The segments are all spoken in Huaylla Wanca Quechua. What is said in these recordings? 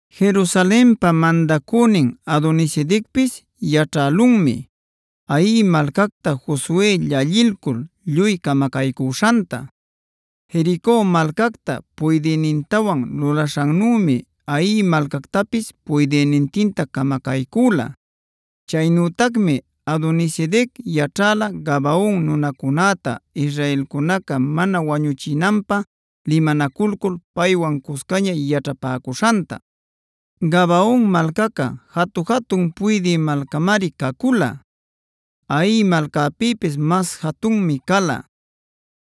Jerusalenpa mandacünin Adonisedecpis yaćhälunmi Hai malcacta Josue llallilcul lluy camacaycüśhanta. Jerico malcacta puydïnintawan lulaśhannümi Hai malcactapis puydïnintinta camacaycüla. Chaynütacmi Adonisedec yaćhäla Gabaon nunacunäta israelcunaca mana wañuchinanpä limanaculcul paywan cuscaña yaćhapäcuśhanta. Gabaon malcaca jatu-jatun puydï malcamari cacula; Hai malcapïpis mas jatunmi cala.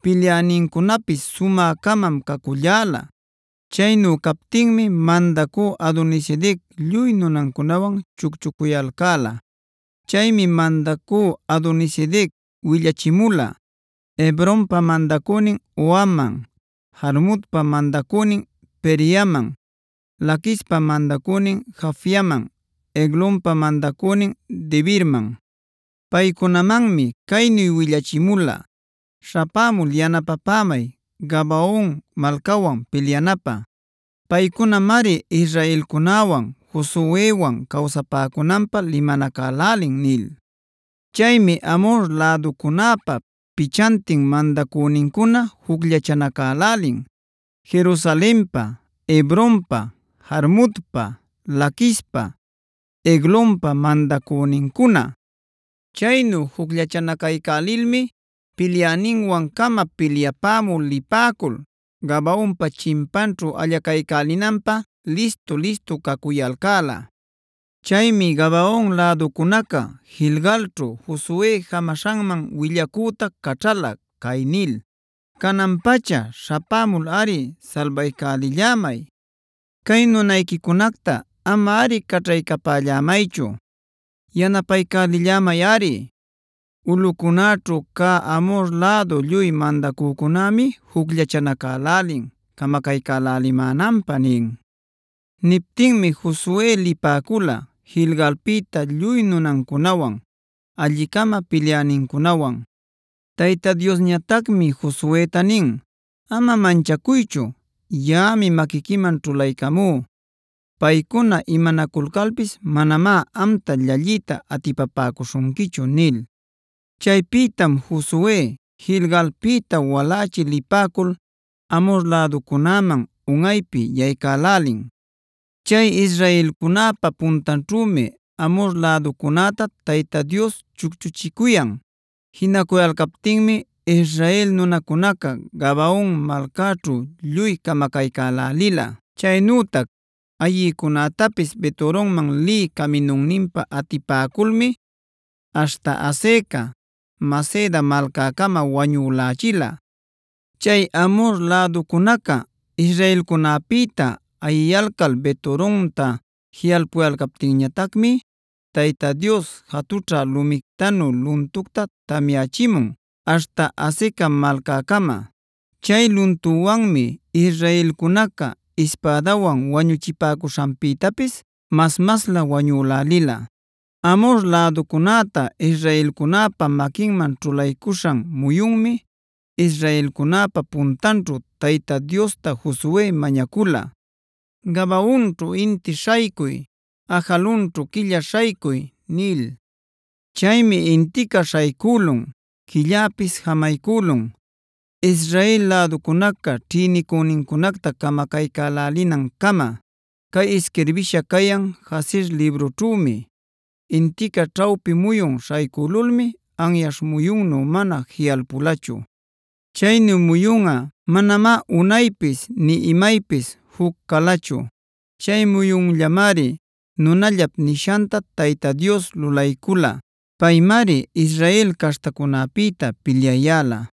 Pilyänincunapis sumä-camam caculläla. Chaynu captinmi mandacü Adonisedec lluy nunancunawan chucchucuyalcäla. Chaymi mandacü Adonisedec willachimula: Hebronpa mandacünin Hohamman, Jarmutpa mandacünin Pireamman, Laquispa mandacünin Jafiaman, Eglonpa mandacünin Debirman. Paycunamanmi caynu willachimula: “Śhapämul yanapapämay Gabaon malcawan pilyanapä. Paycunamari israelcunäwan, Josuewan cawsapäcunanpä limanacälälin” nil. Chaymi Amhor läducunäpa pichantin mandacünincuna jucllachanacälälin: Jerusalenpa, Hebronpa, Jarmutpa, Laquispa, Eglonpa mandacünincuna. Chaynu jucllachanacaycälilmi pilyäninwan-cama pilyapämü lipäcul Gabaonpa chimpanćhu allacaycälinanpä listu-listu cacuyalcäla. Chaymi Gabaon läducunaca Gilgalćhu Josue jamaśhanman willacüta caćhala cay nil: “¡Canan-pacha śhapämulꞌari salbaycälillämay! Cay nunayquicunacta amari caćhaycapallämaychu. Yanapaycälillämayꞌari, ulꞌucunäćhu cä Amhor lädu lluy mandacücunämi jucllachanacälälin camacaycälälimänanpä” nin. Niptinmi Josue lipäcula Gilgalpïta lluy nunancunawan, alli-cama pilyänincunawan. Tayta Diosñatacmi Josueta nin: “Ama manchacuychu, yaꞌami maquiquiman ćhulaycamú. Paycuna imanaculcalpis manamá amta llalliyta atipapäcuśhunquichu” nil. Chaypïtam Josue Gilgalpïta walächi lipäcul Amhor läducunäman unꞌaypi yaycälälin. Chay israelcunäpa puntanćhümi Amhor läducunäta Tayta Dios chucchuchicuyan. Jinacuyalcaptinmi Israel nunacunaca Gabaon malcäćhu lluy camacaycälälila. Chaynütac ayïcunätapis Bet-horonman lï caminunninpa atipäculmi aśhta Azeca, Maceda malcäcama wañülächila. Chay Amhor läducunaca israelcunäpïta ayiyalcal Bet-horonta jiꞌalpuyalcaptinñatacmi Tayta Dios jatućha lumictanu luntucta tamyächimun aśhta Azeca malcäcama. Chay luntuwanmi israelcunaca ispädawan wañuchipäcuśhanpïtapis mas-maslä wañülälila. Amhor läducunäta israelcunäpa maquinman ćhulaycuśhan muyunmi israelcunäpa puntanćhu Tayta Diosta Josue mañacula: “Gabaonćhu inti śhaycuy; Ajalonćhu quilla śhaycuy” nil. Chaymi intica śhaycülun, quilläpis jamaycülun Israel läducunaca ćhïnicünincunacta camacaycälälinancama. Cay isquirbïsha cayan Jasera librućhümi: Intica ćhawpi muyun śhaycülulmi anyaśh muyunnu mana jiꞌalpulachu. Chaynu muyunꞌa manamá unaypis nï imaypis juc calachu. Chay muyunllamari nunallap nishanta Tayta Dios lulaycula. Paymari Israel caśhtacunäpïta pilyayäla.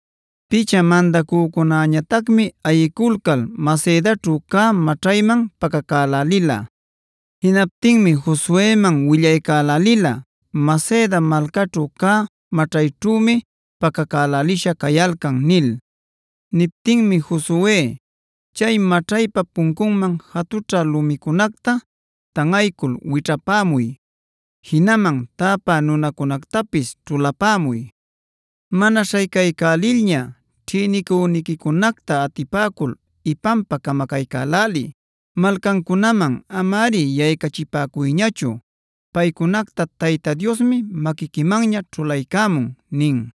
Picha mandacücunäñatacmi ayiculcal Macedaćhu cä maćhayman pacacälälila. Jinaptinmi Josueman willaycälälila: “Maceda malcaćhu cä maćhayćhümi pacacälälisha cayalcan” nil. Niptinmi Josue: “Chay maćhaypa puncunman jatućha lumicunacta tanꞌaycul wićhapämuy. Jinaman täpä nunacunactapis ćhulapämuy. Mana śhaycaycälilña ćhïnicüniquicunacta atipäcul ipanpa camacaycäläliy. Malcancunaman amari yaycachipäcuyñachu. Paycunacta Tayta Diosmi maquiquimanña ćhulaycämun” nin.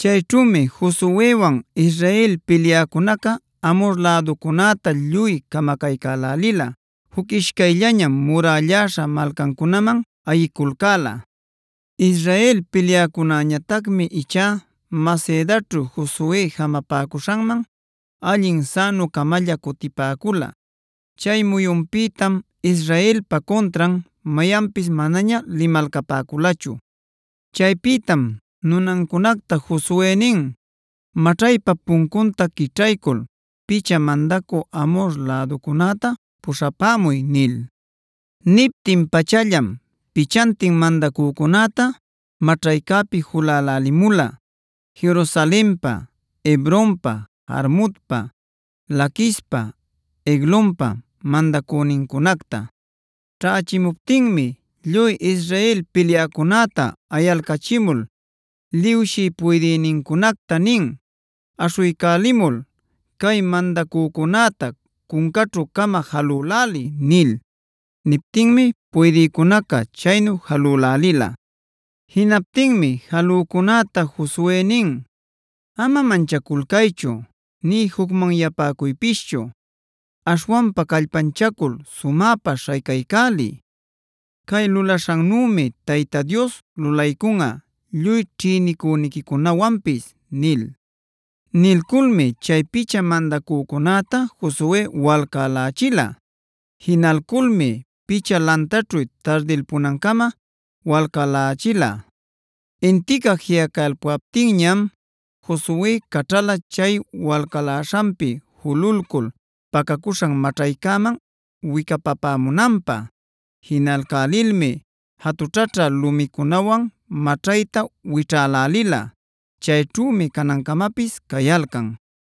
Chayćhümi Josuewan Israel pilyäcunaca Amhor läducunäta lluy camacaycälälila. Juc ishcayllañam murälläśha malcancunaman ayiculcäla. Israel pilyäcunäñatacmi ichá Macedaćhu Josue jamapäcuśhanman allin sänu-camalla cutipäcula. Chay muyunpïtam Israelpa cuntran mayanpis manaña limalcapäculachu. Chaypïtam nunancunacta Josue nin: “Maćhaypa puncunta quićhaycul picha mandacü Amhor läducunäta puśhapämuy” nil. Niptin-pachallam pichantin mandacücunäta maćhaycäpi julälälimula: Jerusalenpa, Hebronpa, Jarmutpa, Laquispa, Eglonpa mandacünincunacta. Ćhächimuptinmi lluy Israel pilyäcunäta ayalcachimul liwshï puydïnincunacta nin: “Aśhuycälimul cay mandacücunäta cuncaćhu-cama jalüläliy” nil. Niptinmi puydïcunaca chaynu jalülälila. Jinaptinmi jalücunäta Josue nin: “Ama manchaculcaychu nï jucmanyapäcuypischu. Aśhwanpa callpanchacul sumäpa śhaycaycäliy. Cay lulaśhannümi Tayta Dios lulaycunꞌa lluy ćhïnicüniquicunawanpis” nil. Nilculmi chay picha mandacücunäta Josue walcälächila. Jinalculmi picha lantaćhu tardilpunancama walcalächila. Intica jiꞌacalpuptinñam Josue caćhala chay walcaläśhanpi jululcul pacacuśhan maćhaycäman wicapapämunanpä. Jinalcälilmi jatućhaćhä lumicunawan maćhayta wićhälälila. Chayćhümi canancamapis cayalcan.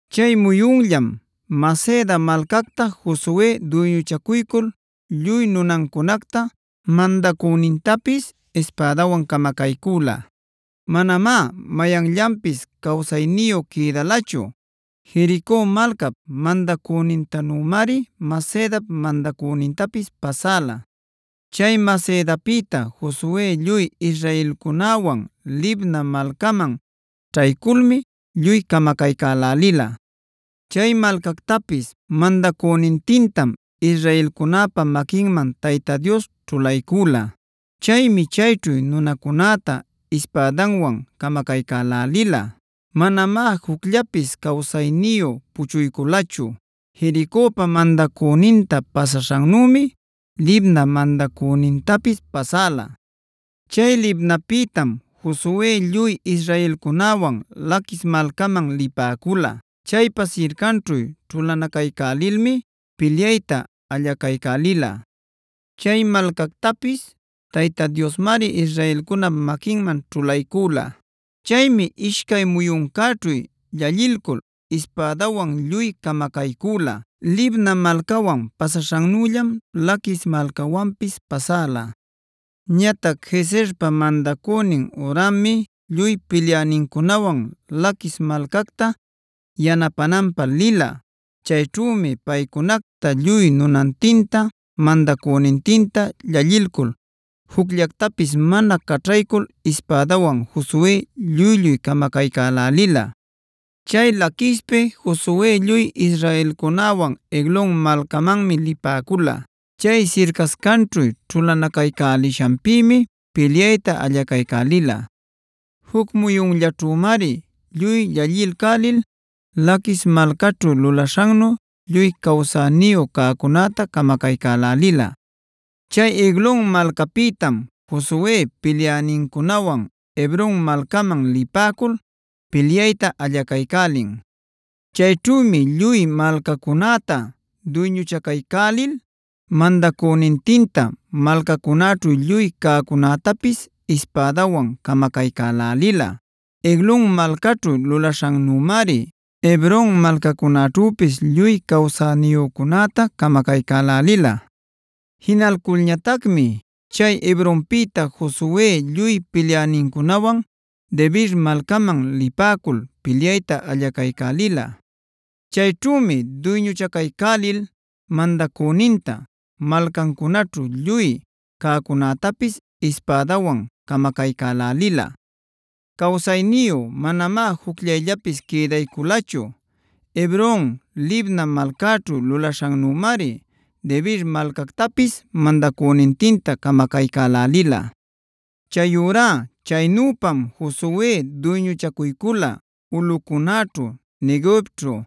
Chay muyunllam Maceda malcacta Josue duyñuchacuycul lluy nunancunacta, mandacünintapis ispädawan camacaycüla. Manamá mayanllapis cawsayniyu quïdalachu. Jerico malcap mandacünintanümari Macedap mandacünintapis pasäla. Chay Macedapïta Josue lluy israelcunäwan Libna malcaman ćhayculmi lluy camacaycälälila. Chay malcactapis mandacünintintam israelcunäpa maquinman Tayta Dios ćhulaycüla. Chaymi chayćhu nunacunäta ispädanwan camacaycälälila. Manamá jucllapis cawsayniyu puchuyculachu. Jericopa mandacüninta pasaśhannümi Libnap mandacünintapis pasäla. Chay Libnapïtam Josue lluy israelcunäwan Laquis malcaman lipäcula. Chaypa sircanćhu ćhulanacaycälilmi pilyayta allacaycälila. Chay malcactapis Tayta Diosmari Israelcunap maquinman ćhulaycüla. Chaymi ishcay muyuncäćhu llallilcul ispädawan lluy camacaycüla. Libna malcawan pasaśhannüllam Laquis malcawanpis pasäla. Ñatac Gezerpa mandacünin Horammi lluy pilyänincunawan Laquis malcacta yanapänanpä lila. Chayćhümi paycunacta lluy nunantinta mandacünintinta llallilcul jucllactapis mana caćhaycul ispädawan Josue lluy-lluy camacaycälälila. Chay Laquispi Josue lluy israelcunäwan Eglon malcamanmi lipäcula. Chay sircascanćhu ćhulanacaycälishanpïmi pilyayta allacaycälila. Juc muyunllaćhümari lluy llallilcälil Laquis malcaćhu lulaśhannu lluy cawsäniyu cäcunäta camacaycälälila. Chay Eglon malcapïtam Josue pilyänincunawan Hebronb malcaman lipäcul pilyayta allacaycälin. Chayćhümi lluy malcacunäta duyñuchacaycälil mandacünintinta, malcancunaćhu lluy cäcunätapis ispädawan camacaycälälila. Eglon malcaćhu lulaśhannümari Hebron malcacunäćhüpis lluy cawsayniyücunäta camacaycälälila. Jinalculñatacmi chay Ebronpïta Josue lluy pilyänincunawan Debirc malcaman lipäcul pilyayta allacaycälila. Chayćhümi duyñuchacaycälil mandacüninta, malcancunaćhu lluy cäcunätapis ispädawan camacaycälälila. Cawsayniyu manamá jucllayllapis quïdayculachu. Hebron, Libna malcaćhu lulaśhannümari Debir malcactapis mandacünintinta camacaycälälila. Chayurá chaynüpam Josue duyñuchacuycula ulꞌucunäćhu, Neguevćhu,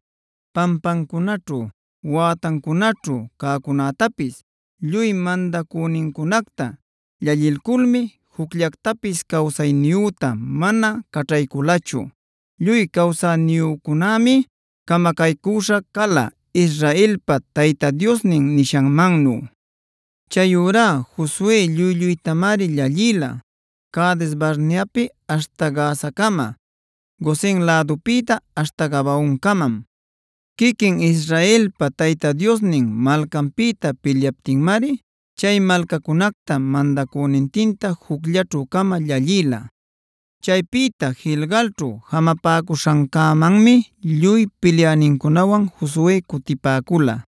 pampancunäćhu, wätancunäćhu cäcunätapis.d Lluy mandacünincunacta llallilculmi jucllactapis cawsayniyüta mana caćhayculachu. Lluy cawsayniyücunämi camacaycüśha cala Israelpa Tayta Diosnin nishanmannu. Chayurá Josue lluy-lluytamari llallïla Cades-barneapie aśhta Gazacama; Gosen lädupïtá aśhta Gabaoncamam. Quiquin Israelpa Tayta Diosnin malcanpïta pilyaptinmari chay malcacunacta, mandacünintinta jucllaćhu-cama llallïla. Chaypïta Gilgalćhu jamapäcuśhancämanmi lluy pilyänincunawan Josue cutipäcula.